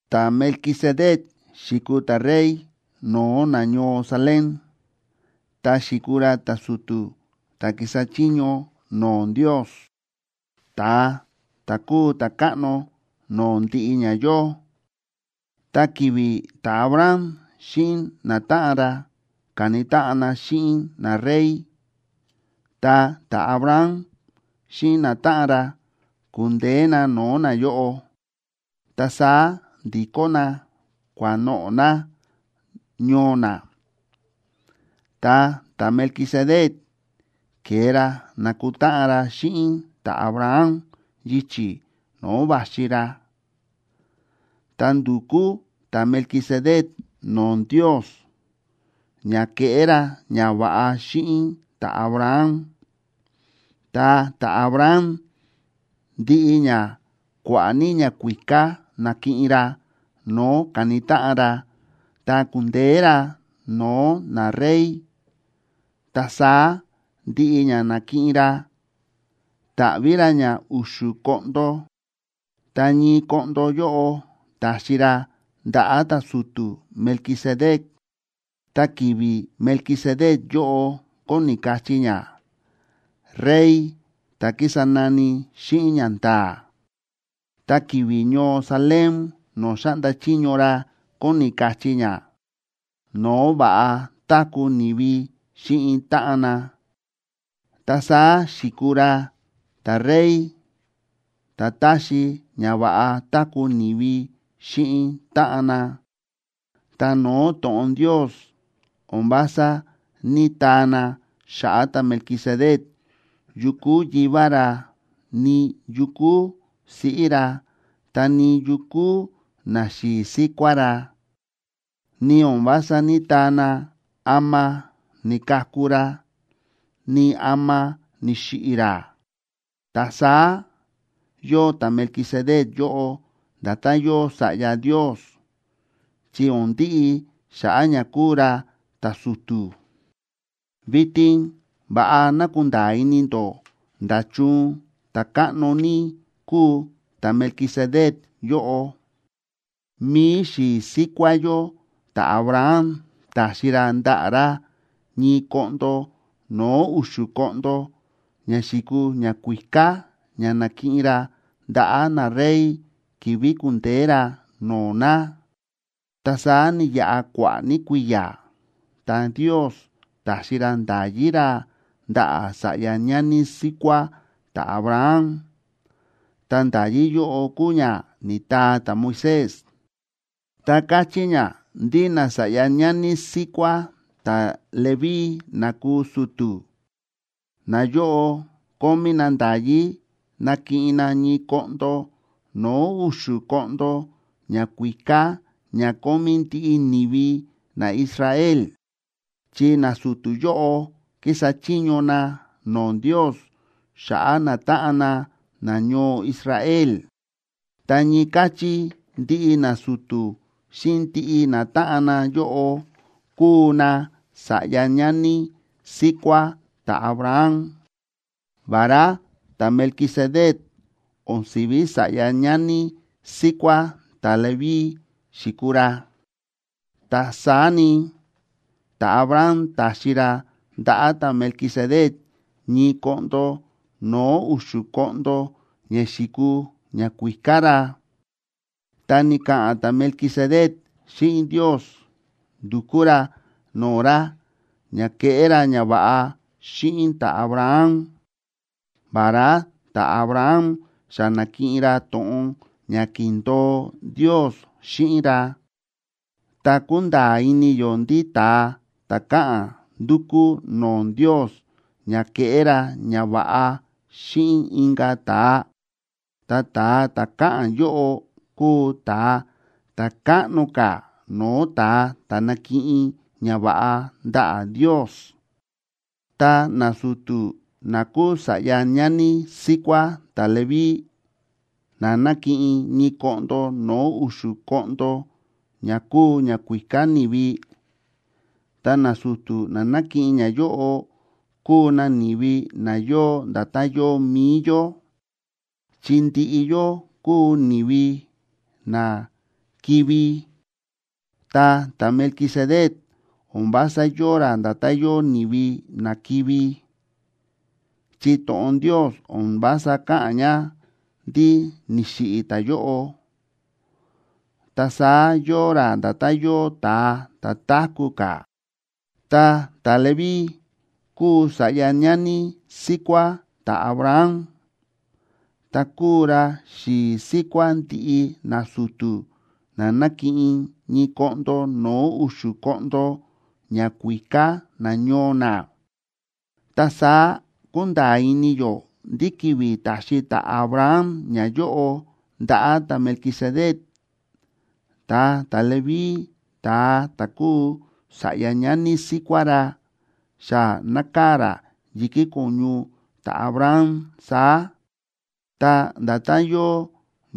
Ta̱Melquisedec xi̱kuu ta̱rey no̱o̱ nañoo Salem, ta xi̱kuu ra ta̱su̱tu̱ ta̱ kísa chiño no̱o̱ Ndios, ta̱a ta̱ kúu ta̱káꞌno no̱o̱ ndiꞌi ña yóo. Ta ki̱vi̱ ta̱Abraham xíꞌin natáꞌan ra ka̱ni táꞌan na xíꞌin narey, ta ta̱Abraham xíꞌin natáꞌan ra ku̱ndeé na no̱o̱ nayóꞌo, ta saá ndi̱kó na kua̱noꞌo̱ na ñoo na. Ta ta̱Melquisedec ke̱e ra na̱kutáꞌan ra xíꞌin ta̱Abraham yichi̱ no̱o̱ va̱xi ra, ta ndu̱kú ta̱Melquisedec no̱o̱ Ndios ña keꞌé ra ñava̱ꞌa xíꞌin ta̱Abraham. Ta ta̱Abraham, ndiꞌi ña kua̱ꞌa̱ ní ñakuíká na̱kiꞌin ra no̱o̱ ka̱ni táꞌan ra tá ku̱ndeé ra no̱o̱ narey, ta saá ndiꞌi ña na̱kiꞌin ra ta̱ꞌví ra ña u̱xu̱ koꞌndo, ta ñii koꞌndo yóꞌo ta̱xi ra ndaꞌa̱ ta̱su̱tu̱ Melquisedec. Ta ki̱vi̱ Melquisedec yóꞌo kóni kachí ña “rey ta̱ kísa nani xíꞌin ñanda̱a̱”, ta ki̱vi̱ ñoo Salem no̱o̱ xáꞌnda chiño ra kóni kachí ña “no̱o̱ va̱ꞌa táku̱ ni̱vi xíꞌin táꞌan na”, ta saá xi̱kuu ra “ta̱rey ta̱ táxi ña va̱ꞌa táku̱ ni̱vi xíꞌin táꞌan na.” Ta no̱o̱ to̱ꞌon Ndios o̱n vása ní‑taa na xa̱ꞌa̱ ta̱Melquisedec yu kúu yivá ra, ni yu kúu siꞌí ra, ta ni yu kúu naxi̱i̱ síkuá ra, ni o̱n vása ní‑taa na ama ni̱kaku ra, ni ama ni̱xiꞌi̱ ra. Ta saá yóo ta̱Melquisedec yóꞌo nda̱tán yóo Sa̱ꞌya Ndios, chi o̱n ndiꞌi xa̱ꞌa̱ ña kúu ra ta̱su̱tu̱. Vitin va̱ꞌa ná kunda̱a̱ ini ndó nda̱chun ta̱káꞌno ní kúu ta̱Melquisedec yóꞌo. Mi̱i xi̱i̱ síkuá yó ta̱Abraham ta̱xi ra ndaꞌa̱ ra ñii koꞌndo no̱o̱ u̱xu̱ koꞌndo ña xi̱kuu ñakuíká ña na̱kiꞌin ra ndaꞌa̱ narey ki̱vi̱ ku̱ndeé ra no̱o̱ na. Ta saá ni̱yaꞌa kua̱ꞌa̱ ní kui̱ya̱ ta Ndios ta̱xi ra nda̱yí ra ndaꞌa̱ sa̱ꞌya ñani síkuá ta̱Abraham. Ta nda̱yí yóꞌo kúu ña ni̱taa ta̱Moisés, ta káchí ña ndí nasa̱ꞌya ñani síkuá ta̱Leví na kúu su̱tu̱, nayóꞌo kómí na nda̱yí nakiꞌin na ñii koꞌndo no̱o̱ u̱xu̱ koꞌndo ñakuíká ña kómí ndiꞌi ni̱vi naIsrael, chi nasu̱tu̱ yóꞌo kísa chiño na no̱o̱ Ndios xa̱ꞌa̱ natáꞌan na nañoo Israel. Ta ñii káchí ndiꞌi nasu̱tu̱ xíꞌin ndiꞌi natáꞌan na yóꞌo kúu nasa̱ꞌya ñani síkuá ta̱Abraham. Vará ta̱Melquisedec o̱n si̱ví sa̱ꞌya ñani síkuá ta̱Leví xi̱kuu ra, ta saá ni, ta̱Abraham ta̱xi ra ndaꞌa̱ ta̱Melquisedec ñii koꞌndo no̱o̱ u̱xu̱ koꞌndo ña xi̱kuu ñakuíká ra, ta ni̱ka̱ꞌa̱n ta̱Melquisedec xíꞌin Ndios ndu̱kú ra no̱o̱ ra ña keꞌé ra ñava̱ꞌa xíꞌin ta̱Abraham, vará ta̱Abraham xa na̱kiꞌin ra to̱ꞌon ña ki̱ndo̱o Ndios xíꞌin ra. Ta kúnda̱a̱ ini yó ndí ta̱a ta̱ káꞌa̱n ndúkú no̱o̱ Ndios ña keꞌé ra ñava̱ꞌa xíꞌin inka̱ ta̱a, ta ta̱a ta̱ káꞌa̱n yóꞌo kúu ta̱a ta̱ káꞌno ka̱ no̱o̱ ta̱a ta̱ nákiꞌin ñava̱ꞌa ndaꞌa̱ Ndios. Ta nasu̱tu̱ na kúu sa̱ꞌya ñani síkuá ta̱Leví na nákiꞌin ñii koꞌndo no̱o̱ u̱xu̱ koꞌndo ña kúu ñakuíká ni̱vi, ta nasu̱tu̱ na nákiꞌin ñayóꞌo kúu na ni̱vi na yóo nda̱tán yóo mi̱i yó, chi ndiꞌi yó kúu ni̱vi na kivi̱. Ta ta̱Melquisedec o̱n vása yóo ra nda̱tán yóo ni̱vi na kivi̱, chi to̱ꞌon Ndios o̱n vása káꞌa̱n ña ndí ni̱xiꞌi̱ ta̱yóꞌo, ta saá yóo ra nda̱tán yóo ta̱a ta̱ táku̱ ka̱. Ta ta̱Leví kúu sa̱ꞌya ñani síkuá ta̱Abraham, ta kúu ra xi̱i̱ síkuá ndiꞌi nasu̱tu̱ na nákiꞌin ñii koꞌndo no̱o̱ u̱xu̱ koꞌndo ñakuíká nañoo na. Ta saá kúnda̱a̱ ini yó ndí ki̱vi̱ ta̱xi ta̱Abraham ñayóꞌo ndaꞌa̱ ta̱Melquisedec, ta ta̱Leví ta̱a ta̱ kúu sa̱ꞌya ñani síkuá ra xa nákaa̱ ra yi̱kí ko̱ñu ta̱Abraham saá, ta nda̱tán yóo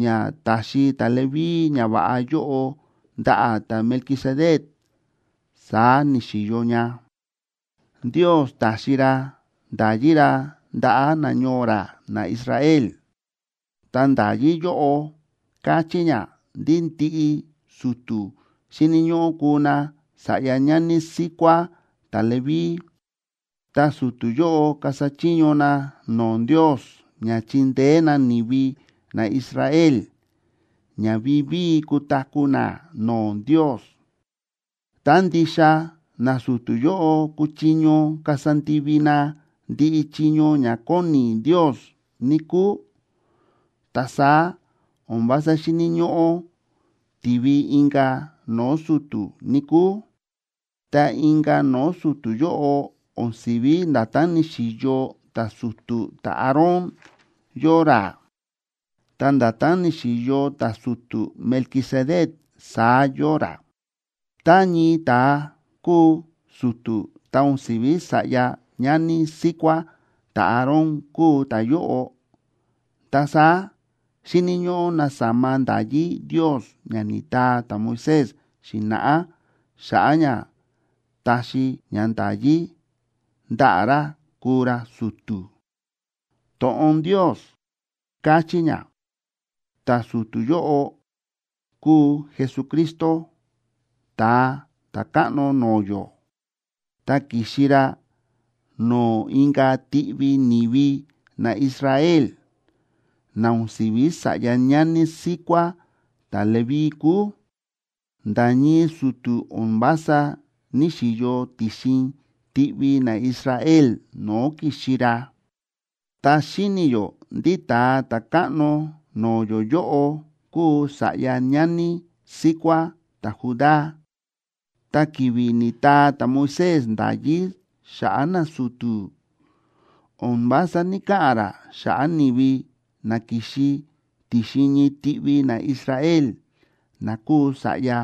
ña ta̱xi ta̱Leví ñava̱ꞌa yóꞌo ndaꞌa̱ ta̱Melquisedec, saá ni̱xi̱yo ña. Ndios ta̱xi ra nda̱yí ra ndaꞌa̱ nañoo ra naIsrael. Ta nda̱yí yóꞌo káchí ña ndí ndiꞌi su̱tu̱ xíni̱ ñóꞌó kuu na sa̱ꞌya ñani síkuá ta̱Leví, ta su̱tu̱ yóꞌo kasa chiño na no̱o̱ Ndios ña chindeé na ni̱vi naIsrael ña vivíi kutaku̱ na no̱o̱ Ndios. Tá ndixa nasu̱tu̱ yóꞌo kuchiño kasa ndivi na ndiꞌi chiño ña kóni Ndios, níkúu, ta saá o̱n vása xíni̱ ñóꞌó tivi inka̱ no̱o̱ su̱tu̱, níkúu. Ta inka̱ no̱o̱ su̱tu̱ yóꞌo o̱n si̱ví nda̱tán ni̱xi̱yo ta̱su̱tu̱ ta̱Aarón yóo ra, ta nda̱tán ni̱xi̱yo ta̱su̱tu̱ Melquisedec saá yóo ra. Tá ñii ta̱a kúu su̱tu̱ ta o̱n si̱ví sa̱ꞌya ñani síkuá ta̱Aarón kúu ta̱yóꞌo, ta saá xíni̱ ñóꞌó nasama nda̱yí Ndios ña ni̱taa ta̱Moisés xi̱na̱ꞌá xa̱ꞌa̱ ña taxi ña nda̱yí ndaꞌa̱ ra kuu ra su̱tu̱. To̱ꞌon Ndios káchí ña ta̱su̱tu̱ yóꞌo kúu Jesucristo, Ta̱a Ta̱káꞌno no̱o̱ yó. Ta ki̱xi ra no̱o̱ inka̱ tiꞌvi ni̱vi naIsrael, na o̱n si̱ví sa̱ꞌya ñani síkuá ta̱Leví kúu. Nda̱ ñii su̱tu̱ o̱n vása ní‑xiyo ti̱xin tiꞌvi naIsrael no̱o̱ ki̱xi ra. Ta xíni̱ yó ndí Ta̱a Ta̱káꞌno no̱o̱ yó yóꞌo kúu sa̱ꞌya ñani síkuá ta̱Judá, ta ki̱vi̱ ni̱taa ta̱Moisés nda̱yí xa̱ꞌa̱ nasu̱tu̱, o̱n vása ní‑kaꞌa̱n ra xa̱ꞌa̱ ni̱vi na ki̱xi ti̱xin ñii tiꞌvi naIsrael na kúu sa̱ꞌya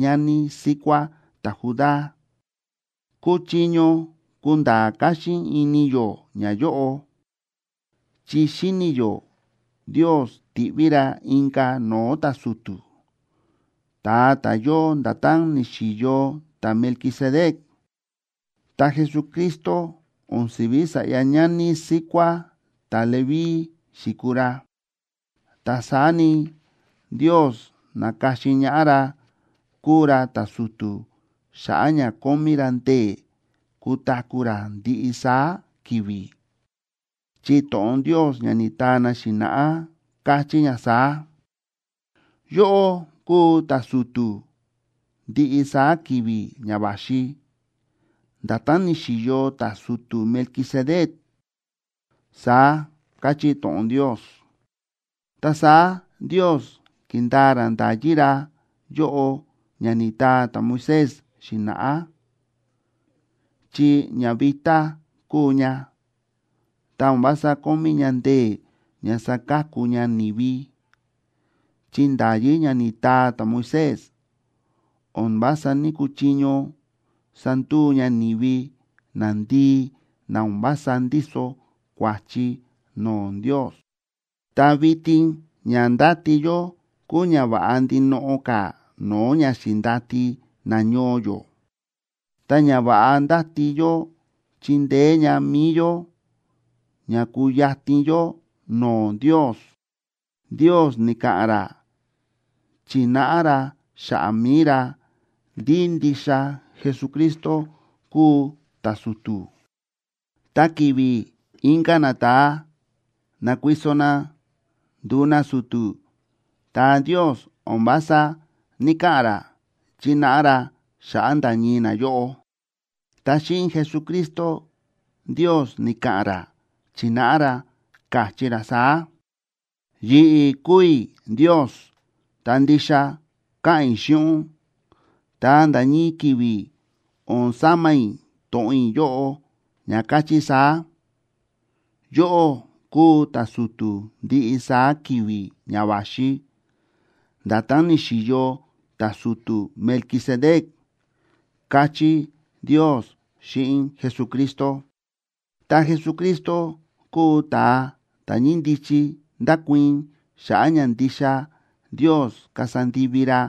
ñani síkuá ta̱Judá. Kúchiño kunda̱a̱ káxín ini yó ñayóꞌo, chi xíni̱ yó Ndios ti̱ꞌví ra inka̱ no̱o̱ ta̱su̱tu̱, ta̱a ta̱ yóo nda̱tán ni̱xi̱yo ta̱Melquisedec. Ta Jesucristo o̱n si̱ví sa̱ꞌya ñani síkuá ta̱Leví xi̱kuu ra, ta saá ni, Ndios na̱ka̱xin ñaꞌá ra kúu ra ta̱su̱tu̱ xa̱ꞌa̱ ña kómí ra ndee̱ kutaku̱ ra ndiꞌi saá ki̱vi̱. Chi to̱ꞌon Ndios ña ni̱taa na xi̱na̱ꞌá káchí ña saá: Yóꞌó kúu ta̱su̱tu̱ ndiꞌi saá ki̱vi̱ ña va̱xi, nda̱tán ni̱xi̱yo ta̱su̱tu̱ Melquisedec, saá káchí to̱ꞌon Ndios. Ta saá Ndios ki̱ndaa ra nda̱yí ra yóꞌo ña ni̱taa ta̱Moisés xi̱na̱ꞌá, chi ña vitá kúu ña, ta o̱n vása kómí ña ndee̱ ña saka̱ku ña ni̱vi. Chi nda̱yí ña ni̱taa ta̱Moisés o̱n vása ní‑kuchiño sanduu ña ni̱vi nandii na o̱n vása ndíso kua̱chi no̱o̱ Ndios. Ta vitin ña ndáti yó kúu ña va̱ꞌa ndinoꞌo ka̱ no̱o̱ ña xi̱ndati nañoo yó, ta ñava̱ꞌa ndáti yó chindeé ña mi̱i yó ña kuyatin yó no̱o̱ Ndios. Ndios ni̱ka̱ꞌa̱n ra chi̱náꞌa ra xa̱ꞌa̱ mi̱i ra ndí ndixa Jesucristo kúu ta̱su̱tu̱. Ta ki̱vi̱ inka̱ nata̱a na̱kuiso na ndu̱u nasu̱tu̱, ta Ndios o̱n vása ní‑kaꞌa̱n ra chínáꞌa ra xa̱ꞌa̱ nda̱ ñii nayóꞌo. Ta xíꞌin Jesucristo, Ndios ni̱ka̱ꞌa̱n ra chi̱náꞌa ra, káchí ra saá: Yi̱ꞌi̱ kúu i̱ Ndios ta ndixa káꞌa̱n i̱ xíꞌin ún, ta nda̱ ñii ki̱vi̱ o̱n sama i̱ to̱ꞌon i̱ yóꞌo ña káchí saá: “Yóꞌó kúu ta̱su̱tu̱ ndiꞌi saá ki̱vi̱ ña va̱xi, nda̱tán ni̱xi̱yo ta̱su̱tu̱ Melquisedec”, káchí Ndios xíꞌin Jesucristo. Ta Jesucristo kúu ta̱a ta̱ ñíndichi ndákuii̱n xa̱ꞌa̱ ña ndixa Ndios kasa ndivi ra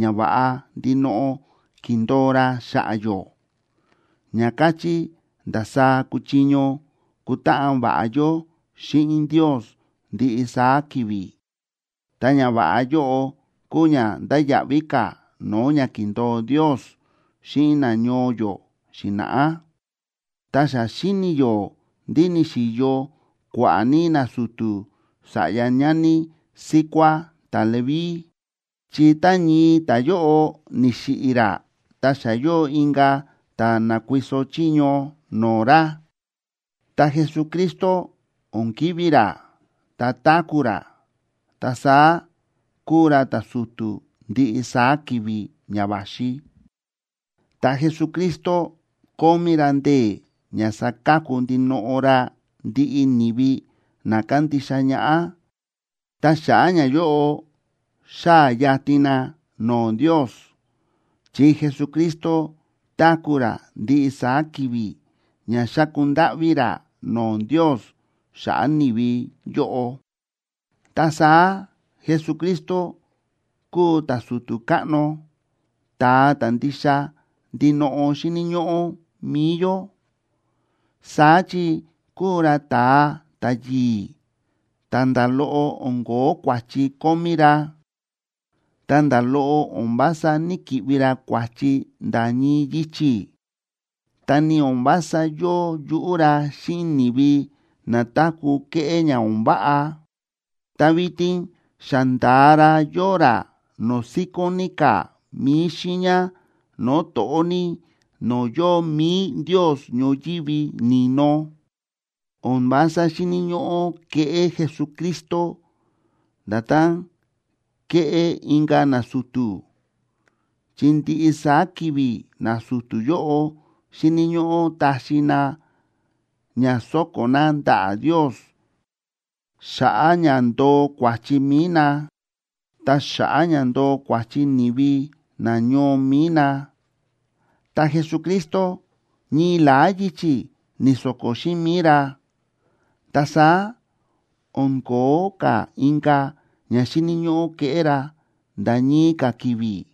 ñava̱ꞌa ndinoꞌo ki̱ndo̱o ra xa̱ꞌa̱ yó, ña káchí ndasaá kuchiño kutáꞌan va̱ꞌa yó xíꞌin Ndios ndiꞌi saá ki̱vi̱, ta ñava̱ꞌa yóꞌo kúu ña ndáya̱ꞌví ka̱ no̱o̱ ña ki̱ndo̱o Ndios xíꞌin nañoo yó xi̱na̱ꞌá. Ta xa xíni̱ yó ndí ni̱xi̱yo kua̱ꞌa̱ ní nasu̱tu̱ sa̱ꞌya ñani síkuá ta̱Leví, chi tá ñii ta̱yóꞌo ni̱xiꞌi̱ ra ta xa yóo inka̱ ta̱ na̱kuiso chiño no̱o̱ ra. Ta Jesucristo o̱n kivi̱ ra, ta táku̱ ra, ta saá kúu ra ta̱su̱tu̱ ndiꞌi saá ki̱vi̱ ña va̱xi. Ta Jesucristo kómí ra ndee̱ ña saka̱ku ndinoꞌo ra ndiꞌi ni̱vi na kándixa ñaꞌá, ta xa̱ꞌa̱ ñayóꞌo xáa̱ yatin na no̱o̱ Ndios. Chi Jesucristo táku̱ ra ndiꞌi saá ki̱vi̱ ña xáku ndáꞌví ra no̱o̱ Ndios xa̱ꞌa̱ ni̱vi yóꞌo. Ta saá Jesucristo kúu ta̱su̱tu̱ káꞌno, ta̱a ta̱ ndixa ndinoꞌo xíni̱ ñóꞌó mi̱i yó. Saá chi kúu ra ta̱a ta̱yi̱i̱, ta nda̱ loꞌo o̱n ko̱ó kua̱chi kómí ra, ta nda̱ loꞌo o̱n vása ní‑kiꞌvi ra kua̱chi nda̱ ñii yichi̱. Ta ni o̱n vása yóo yuꞌú ra xíꞌin ni̱vi na táku̱ kéꞌé ña o̱n váꞌa, ta vitin xa nda̱a ra yóo ra no̱o̱ síkón ní ka̱ mi̱i xiiña no̱o̱ to̱ꞌó ní no̱o̱ yóo mi̱i Ndios ñoyívi ni̱no. O̱n vása xíni̱ ñóꞌó keꞌé Jesucristo nda̱tán kéꞌé inka̱ nasu̱tu̱. Chi ndiꞌi saá ki̱vi̱ nasu̱tu̱ yóꞌo xíni̱ ñóꞌó taxi na ña so̱ko̱ na ndaꞌa̱ Ndios xa̱ꞌa̱ ña ndoo kua̱chi mi̱i na, ta xa̱ꞌa̱ ña ndoo kua̱chi ni̱vi nañoo mi̱i na. Ta Jesucristo ñii la̱á yichi̱ ni̱so̱ko̱ xíꞌin mi̱i ra. Ta saá o̱n ko̱ó ka̱ inka̱ ña xíni̱ ñóꞌó keꞌé ra nda̱ ñii ka̱ ki̱vi̱,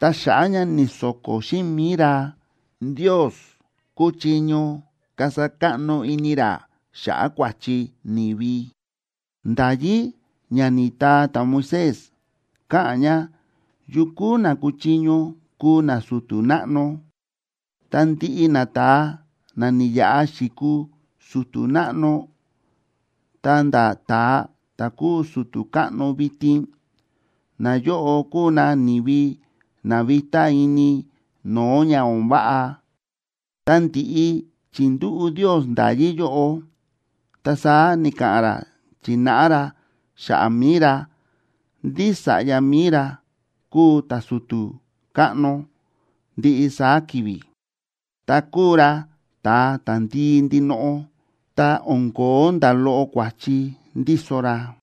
ta xa̱ꞌa̱ ña ni̱so̱ko̱ xíꞌin mi̱i ra, Ndios kúchiño kasa káꞌno ini ra xa̱ꞌa̱ kua̱chi ni̱vi. Nda̱yí ña ni̱taa ta̱Moisés káꞌa̱n ña yu kúu na kúchiño kuu nasu̱tu̱ náꞌno, ta ndiꞌi nata̱a na ni̱yaꞌa xi̱kuu su̱tu̱ náꞌno ta̱nda̱ ta̱a ta̱ kúu su̱tu̱ káꞌno vitin, nayóꞌo kúu na ni̱vi na vitá ini no̱o̱ ña o̱n váꞌa. Ta ndi̱ꞌi chi̱ndúꞌu̱ Ndios nda̱yí yóꞌo, ta saá ni̱ka̱ꞌa̱n ra chi̱náꞌa ra xa̱ꞌa̱ mi̱i ra ndí Sa̱ꞌya mi̱i ra kúu ta̱su̱tu̱ káꞌno ndiꞌi saá ki̱vi̱, ta kúu ra ta̱a ta̱ndii ndinoꞌo, ta o̱n ko̱ó nda̱ loꞌo kua̱chi ndíso ra.